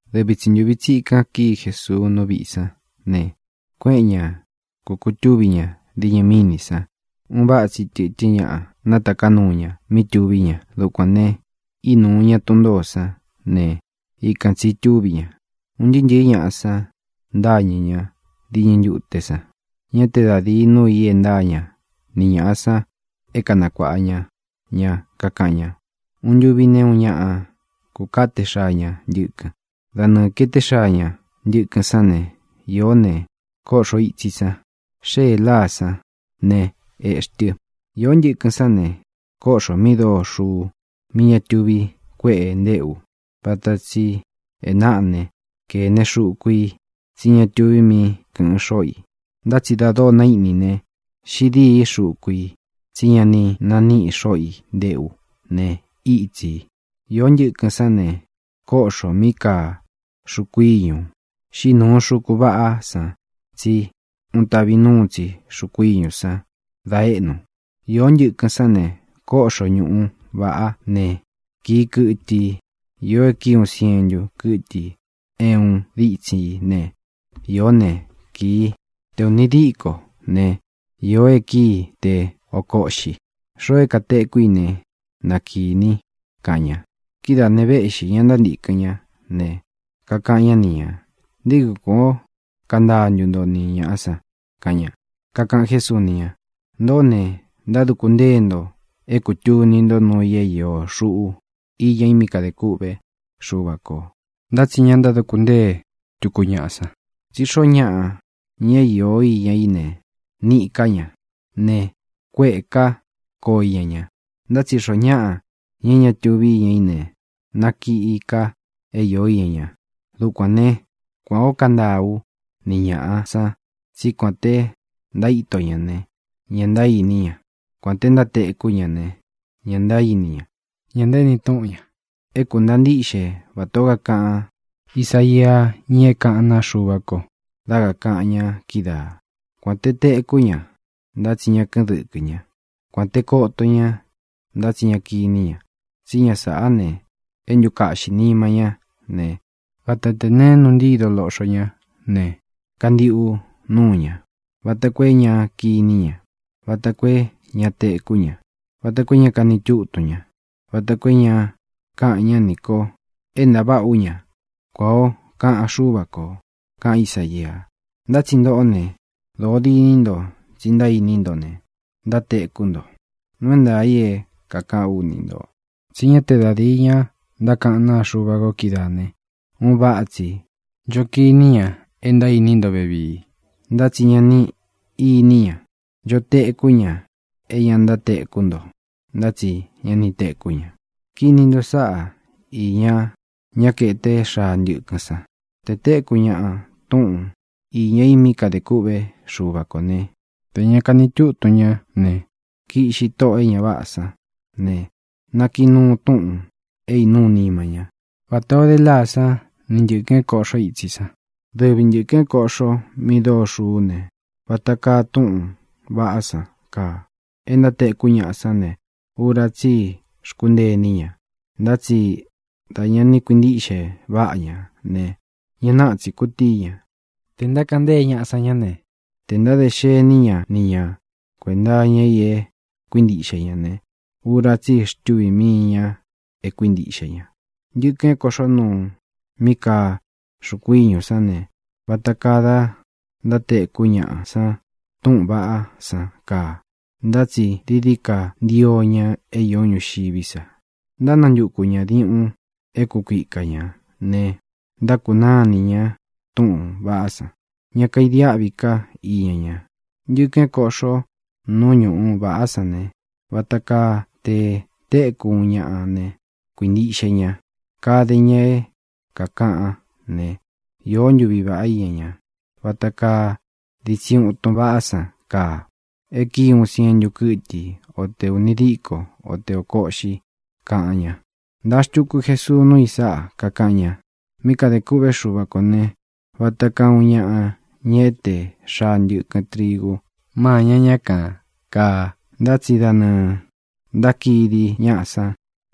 Dɨvi tsi ntūvi tsikan kíi Jesuu nú viꞌī sán ne, kuéꞌen ña kukūtúvi ña diñɨ mínī san. Un váꞌa tsi tɨ̄tɨ́n ñaꞌa nátaká nuu ña mí tuví ña. Dukuān ne, ínuu ña tun ntōó san ne, ikan tsī itúvi ña. Un ntɨɨ́ ntɨ̄ɨ́ ñaꞌa san ntáñɨ̄ ñá diñɨ ntute san. Ñá te da dīi núu i e ntáa ña ni ñāꞌa san é kanakuāꞌa ña ña. Kakaꞌan ña: —Uun ntuvi ne, uun ñaꞌa kúkāté xaa ña ntɨkɨn. Da nɨɨ̄ kaeté xaa ña ntɨkɨn sán ne, īó ne, kóꞌxo itsī san. Xéē láā sán ne, ēꞌxí tɨ. Īó ntɨkɨn sán ne, kóꞌxō mí dóo xuu mí ña túvi kuēꞌe ntéꞌu. Váta tsī e náꞌa ne, kēne xuku i, tsí ña túvī mí kɨ̄ꞌɨn xóꞌo i. Ntá tsi da dóo naíꞌnī ne, xiꞌi dîí xuku i. Tsí ña ni naniꞌi xoꞌo i ntéꞌu ne, ítsī. Īó ntɨkɨn sán ne, kóꞌxō mí kaa xuku íñū. Xíꞌi nūu xuku váꞌā san, tsí un tavi nuu tsi xuku íñū san da éꞌnu. Īó ntɨkɨn sán ne, kóꞌxo ñuꞌu vāꞌá ne, kīi kɨtɨ i. Īó e kíi uun sientu kɨ́tɨ i é uun ditsin í ne, īó ne, kii te ūni díko ne, īó e kíi te ōko uꞌxi. Xoo e katéku í ne, na kīni —kaꞌan ña. Kidáā ne, véꞌxī ña ntántīkɨn ñá ne, kakaꞌan ñá ni ñā: —¿Nté kui kuān ó kantaa ntu nto ni ñāꞌa san? —kaꞌan ña. Kakaꞌan Jésuu ni ña: —Ntōꞌó ne, ntáduku ntée nto é kūtuni nto nuu i é iō xuꞌu iña i mí kadē kûꞌvé Xuva kō, ntá tsi ña ntáduku ntée tuku ñaꞌa san. Tsí xoo ñáꞌa, ña é iō iña í ne, níꞌī ká ña ne, kuéꞌē ká koo iña ña. Ntá tsi xoó ñaꞌa, ña é ña tuvi íña í ne, nakiꞌi ka é iō iña ña. Dukuān né, kuān ó kantaa ú ni ñāꞌa san, tsí kuān te ntaíto ña ne, ña ntaíni ña. Kuān te ntátekú ña ne, ña ntaíni ña. Ña ntaéni túꞌun ñā. É kūntaa ntíꞌxe vatā ó kakaꞌan Ísaia, ña é kaꞌán naa Xuva ko, dá kakāꞌan ña kídaā: Kuān te tekú ña, ntá tsi ña kɨ́ꞌɨn dɨkɨ ña; kuān te koto ña, ntá tsi ña kiní ña. Tsí ña sāꞌá ne, é ntukaꞌxī nima ñá ne, vata te neé nuu ntído loꞌxo ña ne, kantiꞌu núu ña, vata koo é ña kiní ña, vata koo é ña tekú ña, vata koo é ña kani tútun ña, vata koo é ña káꞌān ñá nī ko é ntaváꞌa ú ña, kuan ō kaꞌan Xúva kō, kaꞌan Ísaia. ʼNtá tsi ntoꞌó ne, dōo diní nto tsi ntaíní nto ne, ntátekú nto. Nuu é ntaā i é kākaꞌán u ni ntō tsí ña te da díi ña ntákaꞌán naa Xuva ko kídaā ne, un váꞌa tsi ncho kini ña é ntaíni nto vevii, ntá tsi ña ni iní ña. Ncho tekú ña é ntátekú nto, ntá tsi ña ni tekú ña. ʼKini nto sáꞌa īña ñá kaeté xaa ntɨkɨn san. Te tēkú ñaꞌa túꞌun īña i mí kadē kûꞌvé Xuva kō né, tē ña kani tútun ña ne, kiꞌxi tóꞌō e ña váꞌā san ne, nakiꞌi nuu túꞌūn é īnúu nima ñá, vatā ó de láā sán ni ntɨ̄kɨn é kōꞌxó itsi san. Dɨvi ntɨ̄kɨn é kōꞌxo mi dóo xuú ne, vata kaa túꞌūn vaꞌá san kaa, e ntátekú ñaꞌa san ne, ura tsí i xkúntee iní ña. Ntá tsi da ñā ni kuintíꞌxe váꞌa ña ne, ña náꞌa tsī kutíi ña. Tē ntákaꞌan ntée ñaꞌa san ña ne, tē ntáde xení ña ni ñā kuenta iña i e kuíntiꞌxe ña ne, ura tsí i xtuvī mii ña e kuíntiꞌxe ña. Ntɨ̄kɨn é kōꞌxó nuu mí kaa xuku íñu sán ne, vata kaa da ntátekú ñaꞌa san túꞌūn vaꞌá san kaa, ntá tsi dií dií ka ntio ña é īó ñuxiví sa. Ntánantuku ñā diuꞌun é kukuika ñā ne, ntákunáa inī ña túꞌūn vaꞌá san. Ña kaidiáꞌvi ká i iña ña. Ntɨkɨn é kōꞌxó nuu ñuꞌu vāꞌá san ne, vata kaa te téku uun ñaꞌa ne, kuintiꞌxe ña. Kade ña é kākaꞌán ne, iō ntúvi vāꞌá iña ña. Vata kaa ditsin utun váꞌā san kaa, e kíi uun sientu kɨ́tɨ i, o te ūni díko, o te ōko uꞌxi —kaꞌan ña. Ntāa xtuku Jesuu nuu i sáꞌa, kakaꞌan ña: —Mí kadē kûꞌvé Xuva kō ne, vata kaa uun ñaꞌa, ña e éte xaa ntɨkɨn trigu máña ña kan, kāa. Ntá tsi da nɨɨ̄ ntákidi ñáꞌa san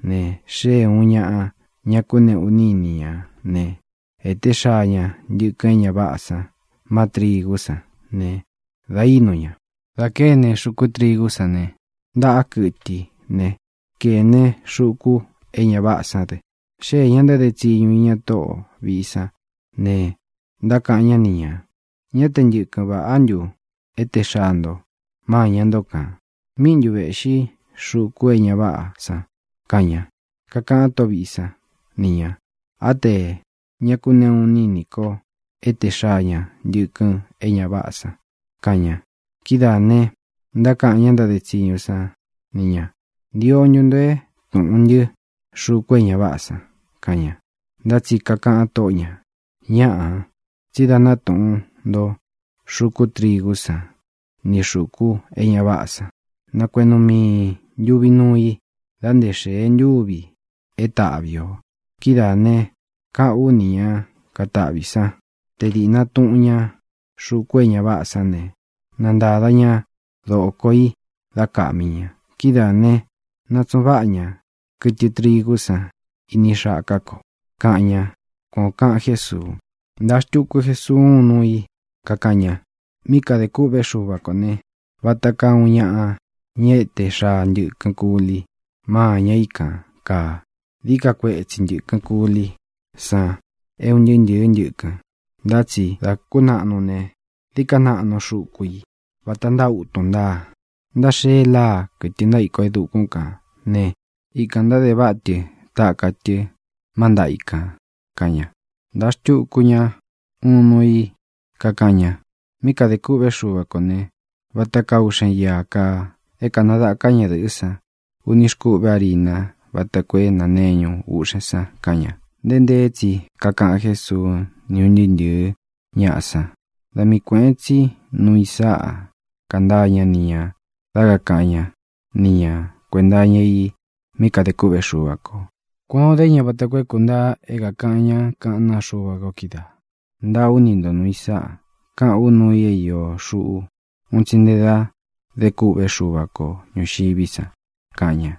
ne, xée ūun ñaꞌa, ña kakuneꞌu iní i ni ñā né, ēté xaa ña ntɨkɨn é ña váꞌā san má trīgú san ne, da ínu ña. Dā kéne xuku trigú san ne, ntaꞌá kɨtɨ i ne, kēne xuku é ña váꞌā sán dɨ. Xéē ña ntáde tsiñu iña tóꞌo vīꞌi sán ne, ntákaꞌan ñá ni ñā: “¿Ñá te ntɨkɨn vāꞌá ntu éte xaa nto máña nto kān? ¿Míꞌi ntu vēꞌxi xuku é ña váꞌā san?”, kaꞌan ña. Kakaꞌan tóꞌo vīꞌi sán ni ñā: “Á tē ñá kakuneꞌu iní i nī ko éte xaa ña ntɨkɨn é ña váꞌā san”, kaꞌan ña. Kidáā ne, ntákaꞌan ñá ntáde tsiñu san ni ñā: “¿Ntio ntu nto é tūꞌun ntɨ́ xuku é ña váꞌā san?”, kaꞌan ña. Ntá tsi kakaꞌan tóꞌo ñā: “Ñáꞌā, tsí dā ná tūꞌun nto xuku trigú san ni xūku é ña váꞌā san. Na kueꞌnu miī ntuvi nuu i da nté xēe ntúvi é taꞌvi ō. Kidáā ne, káꞌān ú ni ña kataꞌvī sán te dīꞌna tuꞌun ña xuku é ña váꞌā sán ne, na ntada ña dōko í dá kāꞌmi ña. Kidáā né, na tsūꞌun váꞌa ña kɨtɨ trigú san ini xaká ko”, kaꞌan ña —kuan ō kaꞌan Jésuu. Ntāa xtuku Jesuu úun nuu i, kakaꞌan ña: —Mí kadē kûꞌvé Xuva kō ne, vata kaa uun ñaꞌa, ña e éte xaa ntɨkɨn kuli mâña i kan, kaa. Dií ka kuetsi ntɨ̄kɨn kúlí san é un ntɨɨ́ ntɨ̄ɨ́ ntɨkɨn, ntá tsi dā kúnaꞌnu ne, dií ka naꞌnu xuku i; vata ntáa utun ntáa. Ntáxee láā, kɨtɨ ntaíko e dukún kān ne, ikān ntáde váꞌa tɨ taka tɨ má ntaꞌa i kān —kaꞌan ña. Ntāa xtuku ña uun nuu i, kakaꞌan ña: —Mí kadē kûꞌvé Xuva kō ne, vata kaa uꞌxen íā kaa, é kānadaká ñadɨ̄ꞌɨ́ san uni xkuꞌve árina váta koo é nāneñu uꞌxen san —kaꞌan ña. Nteé nteé tsi kakaꞌan Jésuu ni ún ntɨɨ́ ntɨ̄ɨ́ ñaꞌa san. Da mii kuēꞌen tsí nuu i sáꞌa kantaa ñá ni ñā dá kakāꞌan ñá ni ñā kuenta iña i mí kadē kûꞌvé Xuva kō. Kuān o dé ña vata koo é kūntaa é kākaꞌan ñá kaꞌán naa Xuva ko kídaā: Ntaa ú ni ntō nuu i sáꞌa, káꞌān ú nuu i é iō xuꞌu un tsi nte dá dé kûꞌvé Xuva ko ñūxiví san, kaꞌan ña.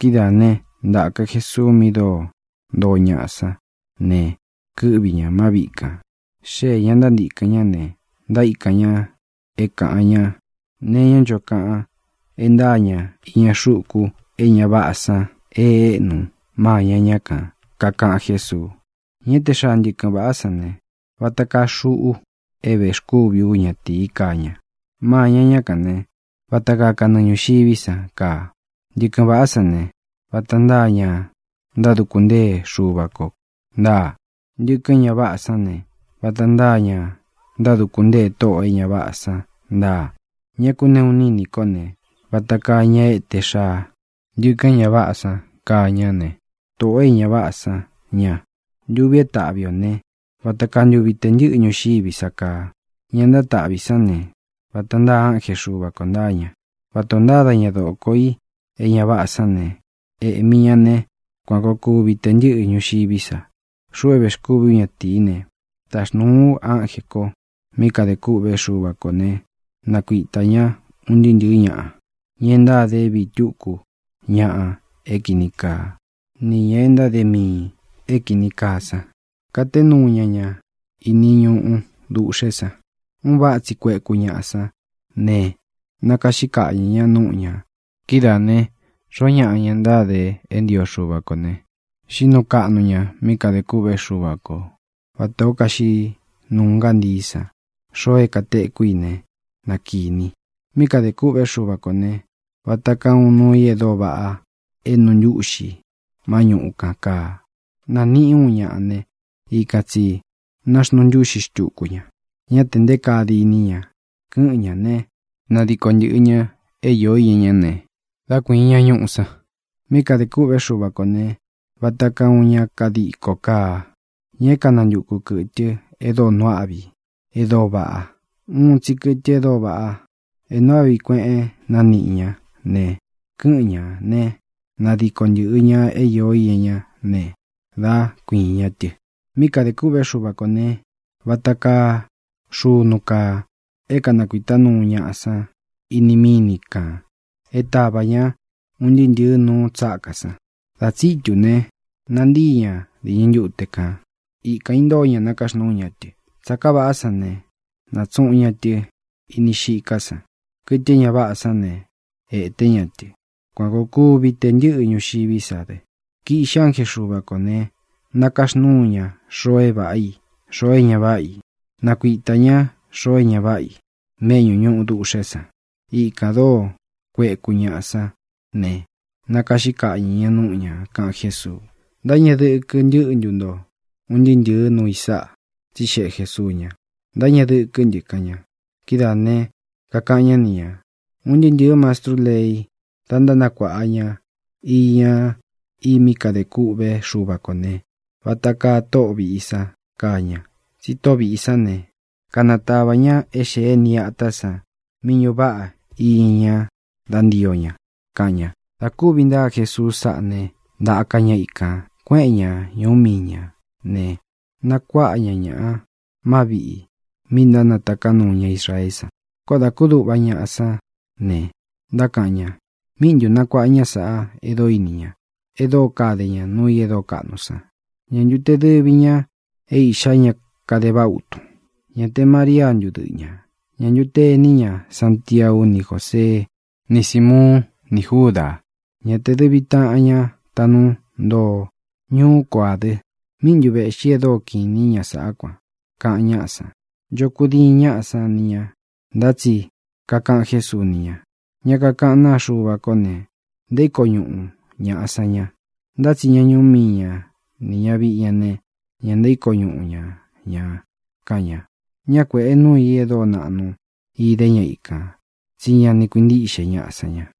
Kidáā né, ntāka Jesuu mí dóo ntoo ñaꞌa sán ne, kɨ́ꞌvi ñā má viꞌi kān. Xéē ña ntántīkɨn ñá ne, ntaíkan ña é kāꞌan ñá nee iñá ncho kaꞌan é ntāa ña iña xuku é ña váꞌā san e éꞌnu máña ña kān. Kakaꞌan Jésuu: —Ña éte xaa ntɨkɨn vāꞌá san ne, vata kaa xuꞌu é vēxkúvi ú ñatīí kaa ña. Mâña ñá kān né, vata kaa kanɨɨ ñūxiví san kaa. Ntɨkɨn vāꞌá san ne, vata ntáa ña ntáduku ntée Xuva kō ntáa. Ntɨkɨn é ña váꞌā san ne, vata ntáa ña ntáduku ntée tóꞌō e ña váꞌā san ntáa. Ña kakuneꞌu iní i nī kó ne, vata kaa ña éte xaa ntɨkɨn é ña váꞌā san kaa ña ne, tōꞌo é ña váꞌā san ña. Ntuvi é taꞌvi ō ne, vata kaa ntuvi tē ntɨ́ꞌɨ ñuxiví sa kaa. Ña ntátaꞌvi sán ne, vata ntáa ánje Xuva kō ntáa ña. Vata ō ntáda ña dōko i é ña váꞌā sán ne, ēꞌmi ña né, kuan koo kuvi tē ntɨ́ꞌɨ ñuxiví sa. Xuꞌu é vēxkúvi ú ñatīí ne, taxnūu ú ánjē ko mí kadē kûꞌvé Xuva kō ne, nakuitā ñá un ntɨɨ́ ntɨ̄ɨ́ ñaꞌa, ña e ntáde é vīí tuku ñaꞌa é kini kaa, nī ña é ntáde miī é kīni kaa san. Katé nuu ña ña iní ñuꞌu dūꞌxé san. Un váꞌa tsi kueku ñaꞌa sán ne, nakaꞌxí kaꞌñɨ̄ ña núꞌu ñā. Kidáā ne, xoó ñaꞌa, ña ntáde é ntio Xuva kō ne, xiꞌí nuu kaꞌnu ña mí kadē kûꞌvé Xuva kō, vatā ó kaxiꞌí nuu ngántií san. Xoo é kātekú i ne, na kīni i. ʼMí kadē kûꞌvé Xuva kō ne, vata kaa uun nuu i e dóo vaꞌa é nuu ntúꞌxi má ñuꞌu kan kāa. Nāniꞌi uun ñaꞌa ne, ikan tsī náxnuu ntúꞌxi xtuku ña. Ñá tē nté kaa diní ña. Kɨ́ꞌɨn ñā né, nadiko ntɨ̄ꞌɨ ña é īó iña ñá ne, dá kuīin ña ñuꞌu san. ʼMí kadē kûꞌvé Xuva kō ne, vata kaa uun ña kadiko kaa, ña é kanantukū kɨtɨ e dóo nuu áꞌvi i, e dóo vaꞌa. Uun tsi kɨtɨ e dóo vaꞌa, é nuu áꞌvi kueꞌen nāniꞌi ñá ne, kɨ́ꞌɨn ñā né, nadiko ntɨ̄ꞌɨ ña é īó iña ñá ne, dá kuīin ña tɨ. ʼMí kadē kûꞌvé Xuva kō ne, vata kaa xunu kaa, é kanakuītá nuu ñaꞌa san ini míni kān é tavā ñá un ntɨɨ́ ntɨ̄ɨ́ nuu tsákā san. Dā tsítū ne, nantíi ña diñɨ ntute kān. Ikān intóo ña nakaxnúu ña tɨ. Tsāká vāꞌá san ne, nātsuꞌun ña tɨ ini xiká san. Kɨtɨ é ña váꞌā san ne, ēte ñá tɨ. Kuan koo kuvi tē ntɨ́ꞌɨ ñuxiví sa dɨ. Kiꞌxi ánje Xuva kō ne, nakaxnúu ña xoo é vāꞌá i, xoo é ña váꞌa i. Nakuitā ñá xoo é ña váꞌa i méꞌñu ñūꞌu duꞌxé san. Ikān dóo kueku ñaꞌa san ne, nakaꞌxí kaꞌñɨ̄ ña núꞌu ñā —kaꞌan Jésuu. —¿Ntáñeꞌe dɨkɨ ntɨ́ꞌɨ ntu nto un ntɨꞌɨ nūu i sáꞌa? —tsixeꞌe Jēsuu ña. —Ntáñeꞌe dɨkɨ́ ntɨ —kaꞌan ña. Kidáā ne, kakaꞌan ñá ni ñā: —Un ntɨɨ́ ntɨ̄ɨ́ mastrú lei, da ntánakuaꞌa ña iña i mí kadē kûꞌvé Xuva kō ne, vata kaa tóꞌo vīꞌi san kaa ña. Tsi tóꞌo vīꞌi sán ne, kanatava ña é xēé nī é atā san mí ñuꞌu váꞌa iña ña dá ntio ña —kaꞌan ña. Dā kúvi ntáa Jesuu sáꞌā né, ntaka ña ikān. Kuéꞌen ña ñūu míi ñā ne, nakuáꞌa ña ñaꞌa má viꞌī mi ntánataká nuu ña Israeé san. Koó dā kúduꞌva ñaꞌa sán ne, ntákaꞌan ña: —¿Míꞌi ntū nakuaꞌa ñá sāꞌa e dóo ini ña, e dóo kade ña nuu i é dóo kaꞌnu san? ¿Ñā ntu te dɨvi ña é iꞌxá ña kade vaꞌa utun? ¿Ñā te María ntu dɨꞌɨ ñā? ¿Ñā ntu te ení ña Santiau ni Jósee ni Símuun ni Júdā? ¿Ñā te dɨvi taꞌan ña taꞌnú ntoo ñuú ko ā dɨ? ¿Míꞌi ntu vēꞌxi é dóo kiꞌin īní ña sāꞌá kuan? —kaꞌan ñáꞌa san. Ncho kudiin ñáꞌa san ni ñā, ntá tsi kakaꞌan Jésuu ni ña: —Ña kakaꞌán naa Xuva kó ne, ntaíko ñuꞌu ñāꞌa san ña; ntá tsi ña ñuú mii ña nī ñaviꞌi ña ne, ña ntaíko ñuꞌu ña ñā —kaꞌan ña. Ñá kuēꞌe núu ī e dóo naꞌnu ide ña ikān, tsí ña ni kuintíꞌxe ñaꞌa san ña.